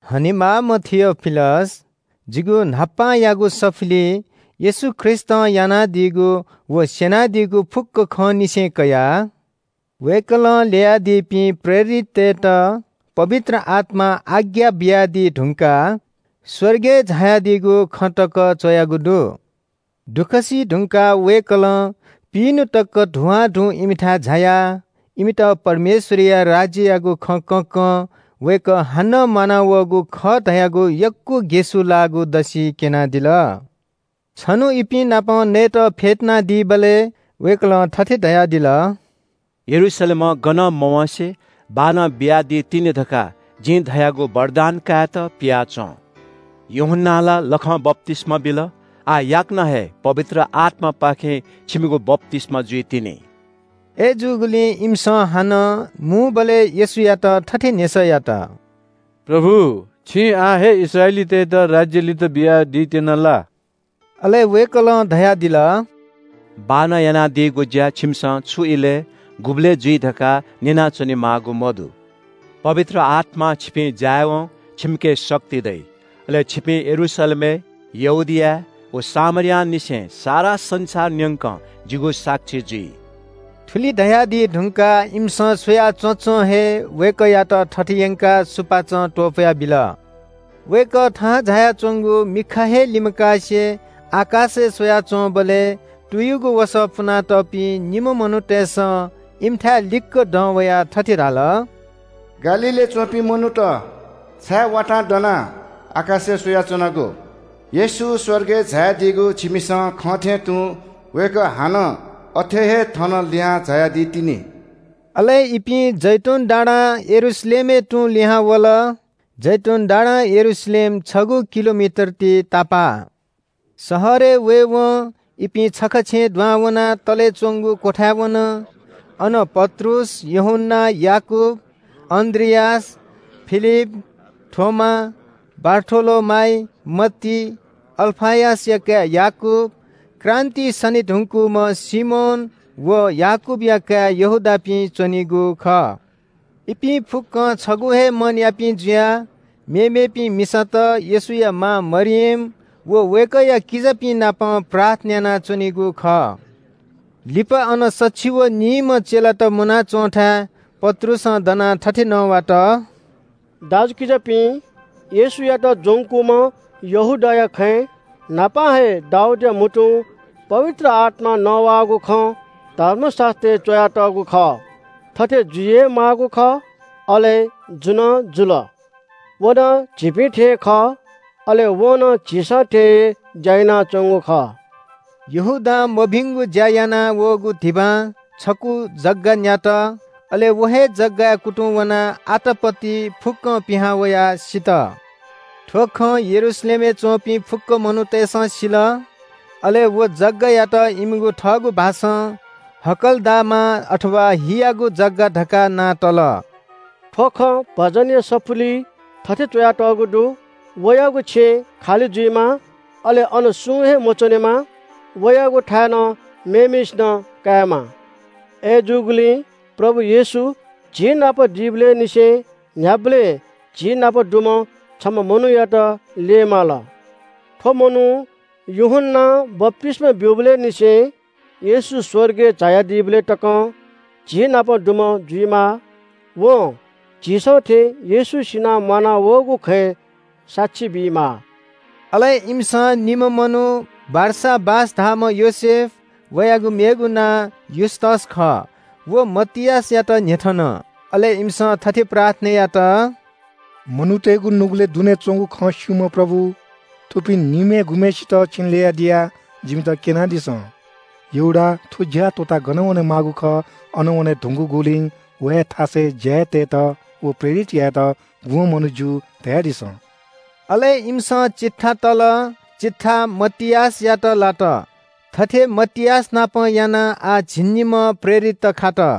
हनेमाःम्‍ह थियोफिलस, जिगु न्‍हापांयागु सफुलिइ येशू ख्रीष्‍टं यानादीगु व स्‍यनादीगु फुक्‍क खंनिसें कयाः वय्‌कलं ल्‍ययादीपिं प्रेरिततय्‌त पवित्र आत्‍मां आज्ञा बियादी धुंकाः स्‍वर्गय् झायादीगु खँ तक च्‍वयागु दु। दुःख सीधुंकाः वय्‌कलं पिइन्‍हु तक धुवांधु इमिथाय् झायाः इमित परमेश्‍वरया राज्‍ययागु खँ कँकं वय्‌कः हानं म्‍वानावःगु खः धयागु यक्‍व ग्‍यसुलाःगु दसि क्‍यनादिल। छन्‍हु इपिं नाप नयेत फ्‍यतुनादीबलय् वय्‌कलं थथे धयादिल – “यरूशलेमं गनं मवँसे बाःनं बियादीतिनि धकाः जिं धयागु वरदान कायेत पियाच्‍वँ। यूहन्‍नां ला लखं बप्‍तिस्‍मा बिल, आः याकनं हे पवित्र आत्‍मापाखें छिमिगु बप्‍तिस्‍मा जुइतिनि।” अय्‌जूगुलिं इमिसं हानं मुंबलय् येशूयात थथे न्‍ह्यसः यात – “प्रभु, छिं आः हे इस्राएलीतय्‌त राज्‍य लित बियादीत्‍यना ला?” अले वय्‌कलं धयादिल – “बाःनं यानादीगु ज्‍या छिमिसं छु इलय्, गुबलय् जुइ धकाः न्‍यना च्‍वनेमाःगु मदु। पवित्र आत्‍मां छिपिं जायेवं छिमिके शक्ति दइ। अले छिपिं यरूशलेमय्, यहूदियाय् व सामरियांनिसें सारा संसार न्‍यंक जिगु साक्षी जुइ।” थुलि धयादी धुंकाः इमिसं स्‍वया च्‍वँच्‍वं हे वय्‌कःयात थत यंकाः सुपाँचं त्‍वपुयाबिल। वय्‌कः थाहां झायाच्‍वंगु मिखा हे लिमकासे आकाशय् स्‍वयाच्‍वंबलय् तुयुगु वसः पुनातःपिं निम्‍ह मनूतय्‌सं इमिथाय् लिक्‍क दं वयाः थथे धाल – “गालीलय् च्‍वंपिं मनूत, छाय् वातां दनाः आकाशय् स्‍वयाच्‍वनागु? येशू स्‍वर्गय् झायादीगु छिमिसं खंथें तुं वय्‌कः हानं अथे हे थन लिहां झायादी तिनि।” अले इपिं जैतून डाँडां यरूशलेमय् तुं लिहां वल। जैतून डाँडां यरूशलेम छगू किलोमिटर ति तापाः। शहरय् वयेवं इपिं छखा छेँय् दुहां वनाः तले च्‍वंगु क्‍वथाय् वन। अन पत्रुस, यूहन्‍ना, याकूब, अन्‍द्रियास, फिलिप, थोमा, बारथोलोमाइ, मत्ती, अल्‍फयसया काय् याकूब, क्रान्‍तिइ सने धुंकूम्‍ह सिमोन व याकूबया काय् यहूदापिं च्‍वनीगु खः। इपिं फुक्‍कं छगू हे मनयापिं जुयाः मेमेपिं मिसात, येशूया मां मरियम व वय्‌कःया किजापिं नाप प्रार्थना यानाच्‍वनीगु खः। लिपा अन सछि व निइम्‍ह चेलात मुनाच्‍वंथाय् पत्रुसं दनाः थथे नवात – “दाजुकिजापिं, येशूयात ज्‍वंकूम्‍ह यहूदाया खँय् न्‍हापां हे दाऊदया म्‍हुतुं पवित्र आत्‍मां नवाःगु खँ धर्मशास्‍त्रय् च्‍वयातःगु खः। थथे जुइ हे माःगु खः, अले जु नं जुल। व नं झीपिं थें खः, अले वं नं झीसं थें हे ज्‍या यानाच्‍वंगु खः।” यहूदां मभिंगु ज्‍या यानावःगु धिबां छकू जग्‍गा न्‍यात। अले व हे जग्‍गाय् कुतुं वनाः आतापति फुक्‍कं पिहां वयाः सित। थ्‍व खँ यरूशलेमय् च्‍वंपिं फुक्‍क मनूतय्‌सं सिल। अले व जग्‍गायात इमिगु थःगु भाषां “हकल्‍दामा”, अथवा “हियागु जग्‍गा” धकाः नां तल। “थ्‍व खँ भजनया सफुलिइ थथे च्‍वयातःगु दु – “‘वयागु छेँ खालि जुइमा, अले अन सुं हे मच्‍वनेमा।’ ‘वयागु थाय् नं मेम्‍हय्‌सिनं कायेमा।’ “अय्‌जूगुलिं प्रभु येशू झीनाप दीबलय् निसें न्‍ह्याबलें झीनाप दुम्‍ह छम्‍ह मनूयात ल्‍यये माल। थ्‍व मनू यूहन्‍नां बप्‍तिस्‍मा ब्‍यूबलय् निसें येशू स्‍वर्गय् झायादीबलय् तकं झीनाप दुम्‍ह जुइमाः। वं झीसं थें येशू सिनाः म्‍वानावःगु खँय् साक्षी बीमाः।” अले इमिसं निम्‍ह मनू बारसाबास धाःम्‍ह योसेफ, (वयागु मेगु नां युस्‍तस खः) व मतियासयात न्‍ह्यथन। अले इमिसं थथे प्रार्थना यात – “मनूतय्‌गु नुगलय् दुने च्‍वंगु खँ स्‍यूम्‍ह प्रभु, थुपिं निम्‍हय् गुम्‍हय्‌सित छिं ल्‍ययादिया, जिमित क्‍यनादिसँ। यहूदा थ्‍व ज्‍या त्‍वःताः गन वनेमाःगु खः अन वने धुंकूगुलिं वया थासय् ज्‍याय् तयेत व प्रेरित यायेत गुम्‍ह मनू ज्‍यू, धयादिसँ?” अले इमिसं चिट्ठा तल, चिट्ठा मतियासयात लात। थथे मतियासनापं यानाः आः झिंनिम्‍ह प्रेरित खात।